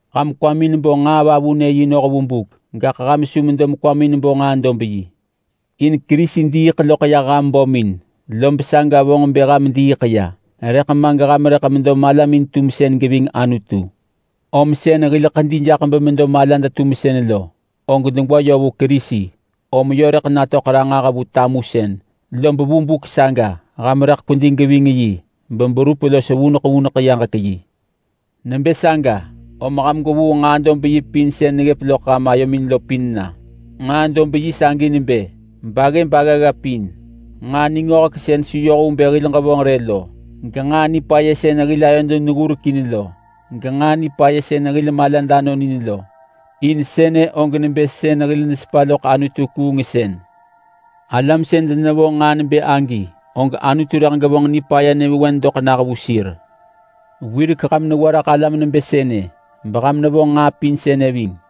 Ham kwamin bo nġaa-vavunë-yi noh vu buk, gaḳ ham su medo mekwamin bo nġaa-dob-yi. In Kerisi diiḳ loḳ yah ham bömin lob saga vonġ bë ham diiḳ ya, rëḳ ma geham rëḳ medo malamin-tumsën geving Anutu. Lom sën hil ḳedi jaḳ bemedo malad-tumsën lo, og degwa yö vu Kerisi, om yö rëḳ natöḳ ranġah vu tamusën, lob vu buk saga ham rëḳ kwedi geving yi beberup los vuneḳ vuneḳ yaġek yi. Nebë saga om ham gwevuu nġaa-dob-yi sën neggëp loḳ ham ayomin lo pin na. Nġaa-dob-yi sagi nebë: Baggëb aggagga pin, nġaa ningöhek sën su yoh vu bë hil ġevonġ rë lo, genġaa nipaya sën hil ayod neggurek in lo, genġaa nipaya sën hil malad anon in lo. In sënë og nebë sën hil nesepa loḳ anutu-kuungsën. Alam sën denevonġ nġaa nebë agi, og Anutu rëḳ gevonġ nipaya nyëvewen doḳ nah vu sir. Wirek ham newa raḳ alam nebë sënë, beham nevonġ nġaa pin sënë ving.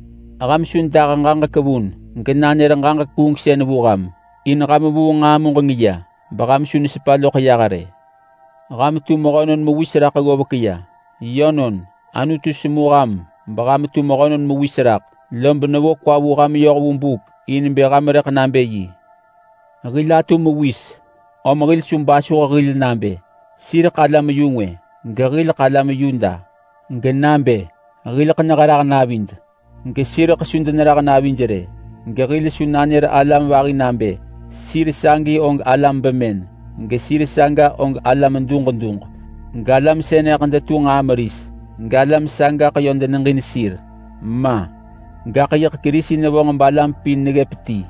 Ham su dah ġaġek vun genanër ġaġek kuungsën vu ham. In ham vuu nġaa muġeng ya, beham su nesepa loḳ yah rë. Ham tu mehönon mewis raḳ ggovek ya. Yönon, Anutu semu ham beham tu mehönon mewis raḳ, lob nevo kwa vu ham yoh vu buk in bë ham rëḳ nabë yi. Hil atu mewis, om hil su basuh hil nabë: Sireḳ alam-yu-ngwë gehileḳ alam Yuda. Genabë, hileḳ neherah navid, gesireḳ su denerah navij rë. Gehil su nanër alam vahi nabë: Sir sagi og alam bemën, gesir saga og alam duġ duġ, galam sënëḳ detu nġaa meris, galam sagaḳ yö deneġin sir. Ma! Gaḳ yiḳ Kerisi nevonġ balam pin neggëp ti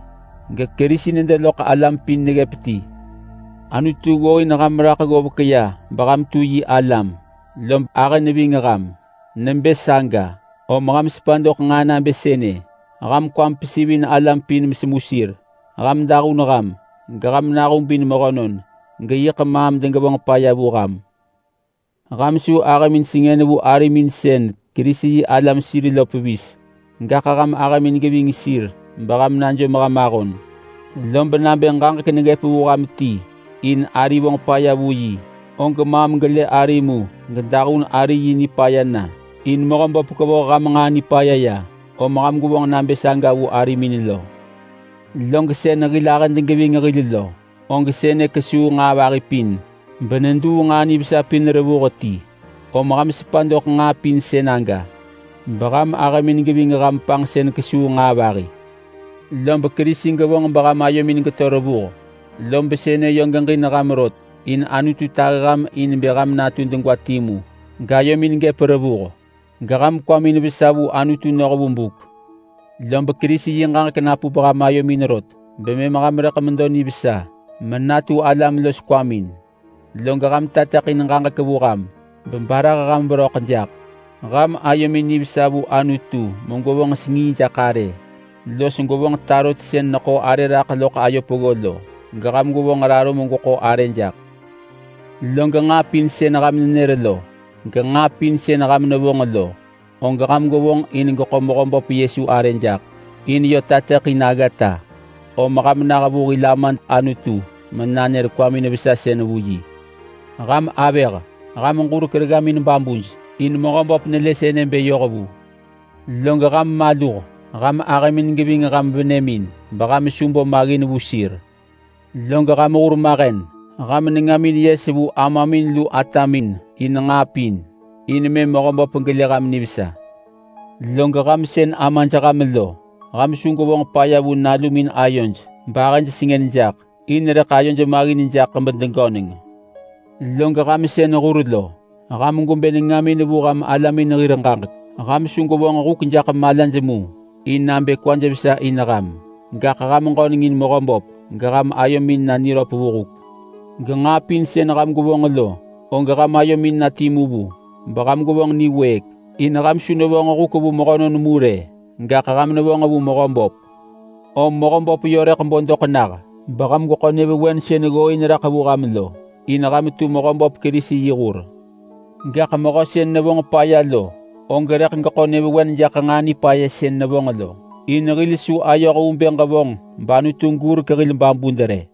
geKerisi nedo loḳ alam pin neggëp ti. Anutu ggooin ham raḳ ggovek ya beham tu yi alam, lob ahë neving ham. Nebë saga, om ham sepa doḳ nġaa nabë sënë: Ham kwamin gevonġin alam pin mesemu sir. Ham dahun ham, geham nahubin mehönon geyiḳ maam degevonġ paya vu ham. Ham su ahëmin sengën vu arimin sën Kerisi-yi-alam sir lo pevis rë, gaḳ ham ahëmin geving sir beham najom ham ahon. Lob nabë ġaġek neggëp vu ham ti in ari vonġ paya vu yi, og maam gelë ari mu gedahun ari yi nipaya na. In Mehöböp kevoh ham nġaa nipaya ya, om ham gwevonġ nabë saga vu arimin lo. Log sën hil ahëd geving hil lo, og sënë kesuu nġaa vahi pin, beneduu nġaa nivesa pin revuh ti. Om ham sepa doḳ nġaa pin sën aga, beham ahëmin geving ham panġsën kesuu nġaa vahi. Lob Kerisi gevonġ beham ayomin geto revuh, lob sënë yö geġin ham rot. In Anutu tahi ham in bë ham natu degwa timu gayomin gëp revuh, geham kwamin vesa vu Anutu noh vu buk. Lob Kerisi yi ġaġek napup ham ayomin rot, bemëm ham rëḳ medo nivesa menatu alam los kwamin. Log ham tateḳin ġaġek vu ham, bebarah ham veröḳ jaḳ. Ham ayomin nivesa vu Anutu megwevonġ sengii jaḳ arë los gwevonġ tarot sën neḳo arë raḳ loḳ ayo peggo lo, geham gwevonġ raro megweḳo arë jaḳ. Log nġaa pin sën ham nenër lo genġaa pin sën ham nevonġ lo, og ham gwevonġ in geḳo Mehöböp Yesu arë jaḳ, in yö tateḳin aggata, om ham nah vu hil Amad Anutu menanër kwamin vesasën vu yi. Ham avëh, ham ġurek reggamin babuj, in Mehöböp nelë sënë bë yohvu. Log ham maluh! Ham ahëmin geving ham venëmin, beham su bo maggin vu sir. Log ham hurmahen, ham nengamin yes vu amamin lu atamin in nġaa pin, in mëm Mehöböp gelë ham nivesa. Log ham sën amaj ham lo, ham su gwevonġ paya vu nalumin ayoj bahëj sengën jaḳ, in rëḳ ayoj maggin jaḳ bedegöneng. Log ham sën hur lo, ham gwebë nengamin vu ham alamin hir ġaġek. Ham su gwevonġ huk jaḳ malaj mu in nabë kwaj vesa in ham. Gaḳ ham ġönengin Mehöböp, geham ayomin na niröp vu huk. Genġaa pin sën ham gwevonġ lo, og ham ayomin na timu vu beham gwevonġ niwëëk. In ham su nevonġ huk vu mehönon mu rë, gaḳ ham nevonġ vu Mehöböp. Om Mehöböp yö rëḳ bo doḳ nah beham gweḳo nyëvewen sën ggooin raḳ vu ham lo. In ham tu Mehöböp Kerisi yi hur. Gaḳ mehö sën nabë gevonġ paya lo, og rëḳ geḳo nyëvewen jaḳ nġaa nipaya sën nevonġ lo. In hil su ayoh vu bë ġevonġ bAnutu gurek hil babud rë.